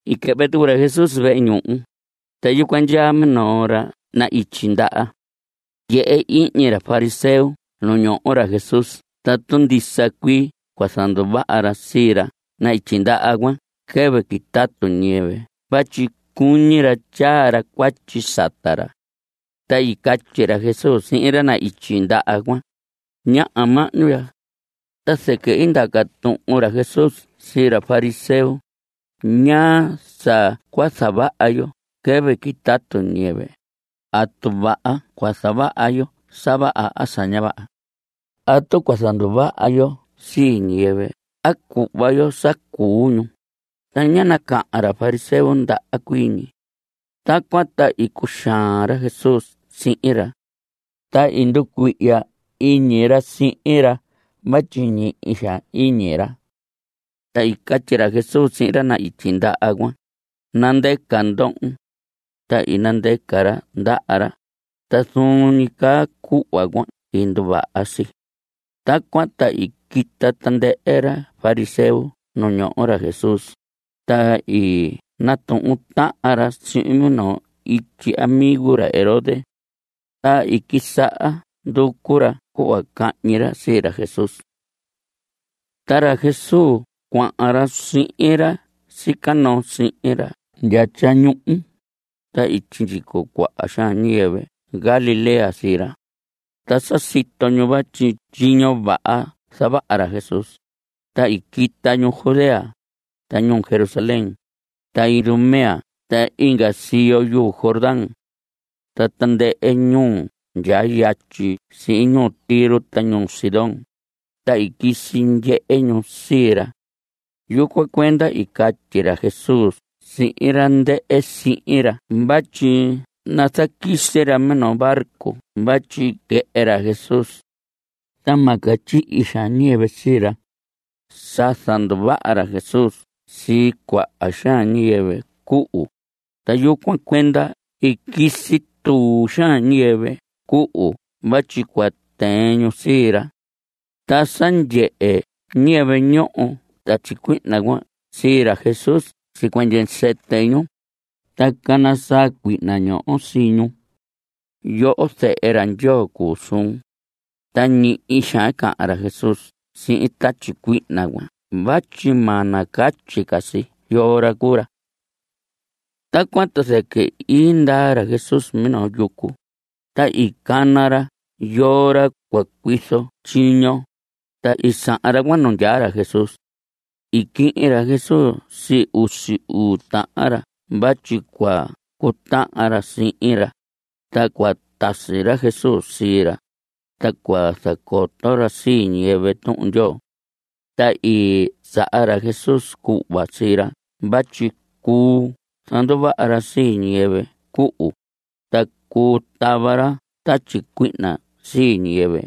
I quɨhvɨ tucu ra Jesús vehe ñuhu, ta yucuan ndyaa minoo ra na‑ityi ndaha. Ndyehe ihñi ra fariseo nu ñoho ra Jesús tatu ndisa cuii cua zanduvaha ra sii ra na‑ityi ndaha cuan quɨvɨ quitatu ñiyɨvɨ vatyi cuñi ra tyaa ra cuatyi sata ra. Ta i catyi ra Jesús sihin ra na‑ityi ndaha cuan: Ñaha mahñu ya. Ta zɨquɨ i ndaca tuhun ra Jesús sii ra fariseo: ¿Ñaa sa cua zavaha yo quɨvɨ quitatu ñiyɨvɨ? ¿Atu vaha cua zavaha yo sa vaha a sa ña vaha? ¿Atu cua zanduvaha yo sii ñiyɨvɨ a cuhva yo sa cuu ñu? Ta ñá nacahan ra fariseo ndaha cuii ñi. Tacuan ta i cuxaan ra Jesús sihin ra, ta i nducuihya iñi ra sihin ra vatyi ñihi xaan iñi ra. Ta i catyi ra Jesús sihin ra na‑ityi ndaha cuan: Nandɨca ndohon. Ta i nandɨca ra ndaha ra, ta zuun ñi caa cuhva cuan i nduvaha si. Tacuan ta i quita tandɨhɨ ra fariseo nu ñoho ra Jesús, ta i natuhun tahan ra sihin minoo ityi amigo ra Herodes. Ta i quisaha nducu ra cuhva cahñi ra sii ra Jesús. Ta ra Jesús cuahan ra sihin ra sica noo sihin ra ndya tyañuhu, ta i sindyico cuahan xaan ñiyɨvɨ Galilea sii ra. Ta sa sito ñu vatyi tyiño vaha zavaha ra Jesús, ta i quita ñu Judea, ta ñuu Jerusalén, ta Idumea ta inga siyo yuu Jordán. Ta tandɨhɨ ñuu ndyaa yatyi sii ñuu Tiro ta ñuu Sidón, ta i quisi ndyehe ñu sii ra. Yucuan cuenda i catyi ra Jesús sihin ra ndɨhɨ sihin ra vatyi nazaquisi ra minoo barco vatyi quɨhɨ ra Jesús, ta ma catyihi xaan ñiyɨvɨ sii ra. Sa zanduvaha ra Jesús sii cuaha xaan ñiyɨvɨ cuhu, ta yucuan cuenda i quisi tuu xaan ñiyɨvɨ cuhu vatyi cua tɨɨn ñu sii ra. Ta sa ndyehe ñiyɨvɨ ñoho tatyi cuihna cuan sii ra Jesús sicuɨñɨ sɨtɨ ñu, ta cana saa cuihna ñoho sii ñu: ¡Yoho, zehe ra Ndyoo cuu suun! Ta ñihi xaan i cahan ra Jesús sihin tatyi cuihna cuan vatyi ma nacatyi ca si yoo ra cuu ra. Tacuan ta zɨquɨ i ndaa ra Jesús minoo yucu, ta i cana ra yoo ra cua cuizo tyiño, ta i sahan ra cuan nu ndyaa ra Jesús. I quihin ra Jesús sii usi uu tahan ra vatyi cua cutahan ra sihin ra, ta cua tasi ra Jesús sii ra, ta cua zacoto ra sii ñiyɨvɨ Tuhun Ndyoo. Ta i saha ra Jesús cuhva sii ra vatyi cuu zanduvaha ra sii ñiyɨvɨ cuhu, ta cuu tava ra tatyi cuihna sii ñiyɨvɨ.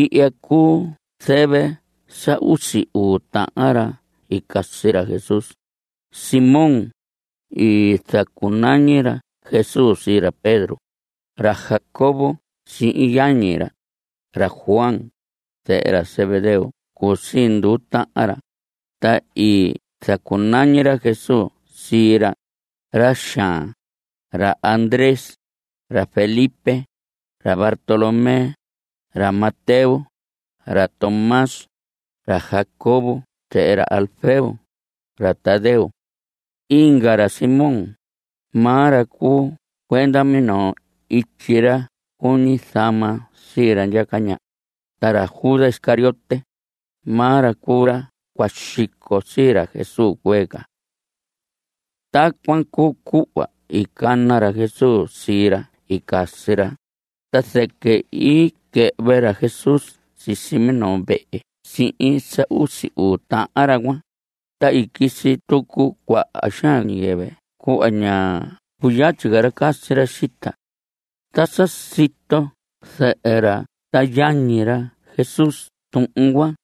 Ihya cuu zɨvɨ sa usi uu tahan ra i casi ra Jesús: Simón, i zacunañi ra Jesús sii ra Pedro; ra Jacobo sihin yañi ra, ra Juan, zehe ra Zebedeo cuu sii nduu tahan ra, ta i zacunañi ra Jesús sii ra, ra xaan; ra Andrés, ra Felipe, ra Bartolomé, ra Mateo, ra Tomás, ra Jacobo zehe ra Alfeo; ra Tadeo, inga ra Simón, maa ra cuu cuenda minoo ityi ra cuñi zama sii ra ndyaca ñaha, ta ra Judas Iscariote, maa ra cuu ra cua xico sii ra Jesús cuee ca. Tacuan cuu cuhva i cana ra Jesús sii ra i casi ra, ta zɨquɨ i quɨhvɨ ra Jesús sisi minoo vehe sihin sa usi uu tahan ra cuan, ta i quisi tucu cuaha xaan ñiyɨvɨ cuhva ña cuyatyi ca ra casi ra xita. Ta sa sito zɨhɨ ra ta yañi ra Jesús tuhun cuan,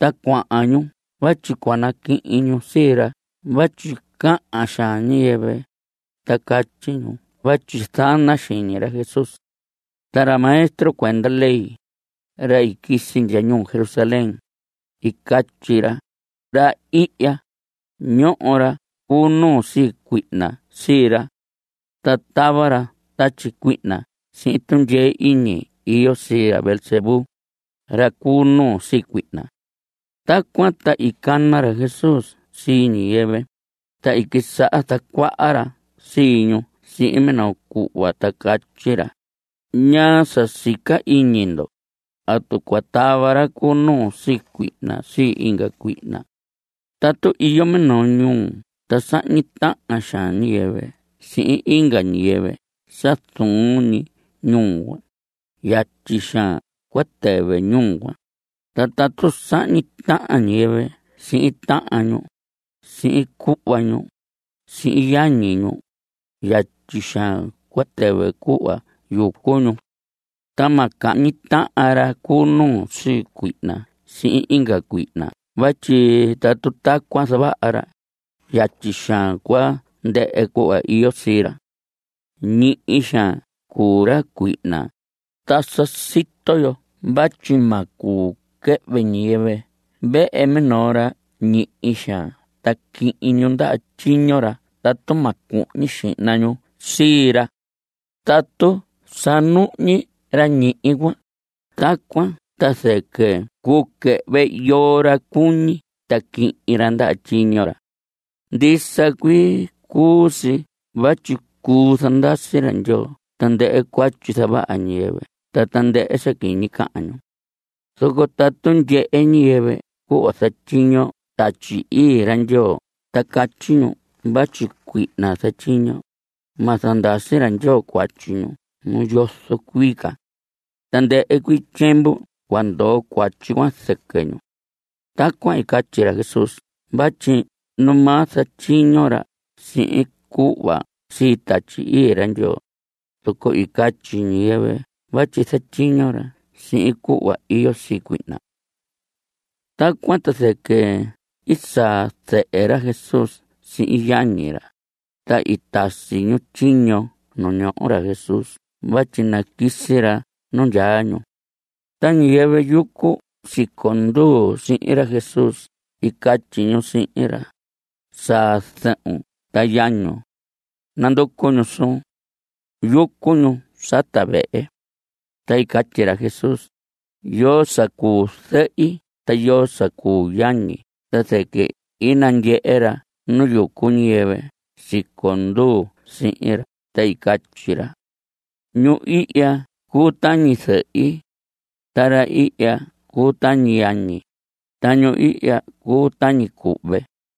ta cuahan ñu vatyi cua naquihin ñu sii ra vatyi cahan xaan ñiyɨvɨ, ta catyi ñu vatyi zana xiñi ra Jesús. Ta ra maestro cuenda ley, ra i quisi ndya ñuu Jerusalén, i catyi ra: Ra ihya, ñoho ra cu nuu sii cuihna sii ra. Ta tava ra tatyi cuihna sihin tundyee iñi iyo sii ra Beelzebú, ra cu nuu sii cuihna. Tacuan ta i cana ra Jesús sii ñiyɨvɨ, ta i quisaha zacuaha ra sii ñu sihin minoo cuhva ta catyi ra: ¿Ñaa sa sica iñi ndo? ¿Atu cua tava ra cu nuu sii cuihna sii inga cuihna? Tatu iyo minoo ñuu ta sahñi tahan xaan ñiyɨvɨ sihin inga ñiyɨvɨ sa zuun ñi ñuu cuan, yatyi xaan cua tɨvɨ ñuu cuan. Ta tatu sahñi tahan ñiyɨvɨ sihin tahan ñu, sihin cuhva ñu, sihin yañi ñu, yatyi xaan cua tɨvɨ cuhva yucu ñu. Ta ma cahñi tahan ra cu nuu sii cuihna sihin inga cuihna vatyi tatu tacuan zavaha ra, yatyi xaan cua ndɨhɨ cuhva iyo sii ra. Ñihi xaan cuu ra cuihna, ta sa sito yo vatyi ma cuu quɨhvɨ ñiyɨvɨ vehe minoo ra ñihi xaan ta quihin ñu ndaha tyiño ra tatu ma cuhñi xihna ñu sii ra. Tatu sa nuhñi ra ñihi cuan, tacuan ta zɨquɨ cuu quɨhvɨ yoo ra cuñi ta quihin ra ndaha tyiño ra. Ndisa cuii cuu si vatyi cuu zandasi ra Ndyoo tandɨhɨ cuatyi zavaha ñiyɨvɨ ta tandɨhɨ sa quiñi cahan ñu. Zoco tatu ndyehe ñiyɨvɨ cuhva zatyiño Tatyi Ii ra Ndyoo ta catyi ñu vatyi cuihna zatyiño, ma zandasi ra Ndyoo cuatyi ñu nu yozo cuii ca. Tandɨhɨ cuii tyiemvu cua ndoo cuatyi cuan zɨquɨ ñu. Tacuan i catyi ra Jesús vatyi numaa zatyiño ra sihin cuhva sii Tatyi Ii ra Ndyoo, zoco i catyi ñiyɨvɨ vatyi zatyiño ra sihin cuhva iyo sii cuihna. Tacuan ta zɨquɨ i saa zɨhɨ ra Jesús sihin yañi ra, ta i tasi ñu tyiño ñu ñoho ra Jesús vatyi naquisi ra nu ndyaa ñu. Ta ñiyɨvɨ yucu siconduu sihin ra Jesús i catyi ñu sihin ra: Saa zɨhun ta yañun. Nanducu ñu suun. Yucu ñu sata vehe. Ta i catyi ra Jesús: ¿Yoo sa cuu zɨhi? ¿Ta yoo sa cuu yañi? Ta zɨquɨ i nandyehe ra nu yucu ñiyɨvɨ siconduu sihin ra, ta i catyi ra: Ñu ihya cuu tañi zɨhi. Ta ra ihya cuu tañi yañi. Ta ñu ihya cuu tañi cuhve.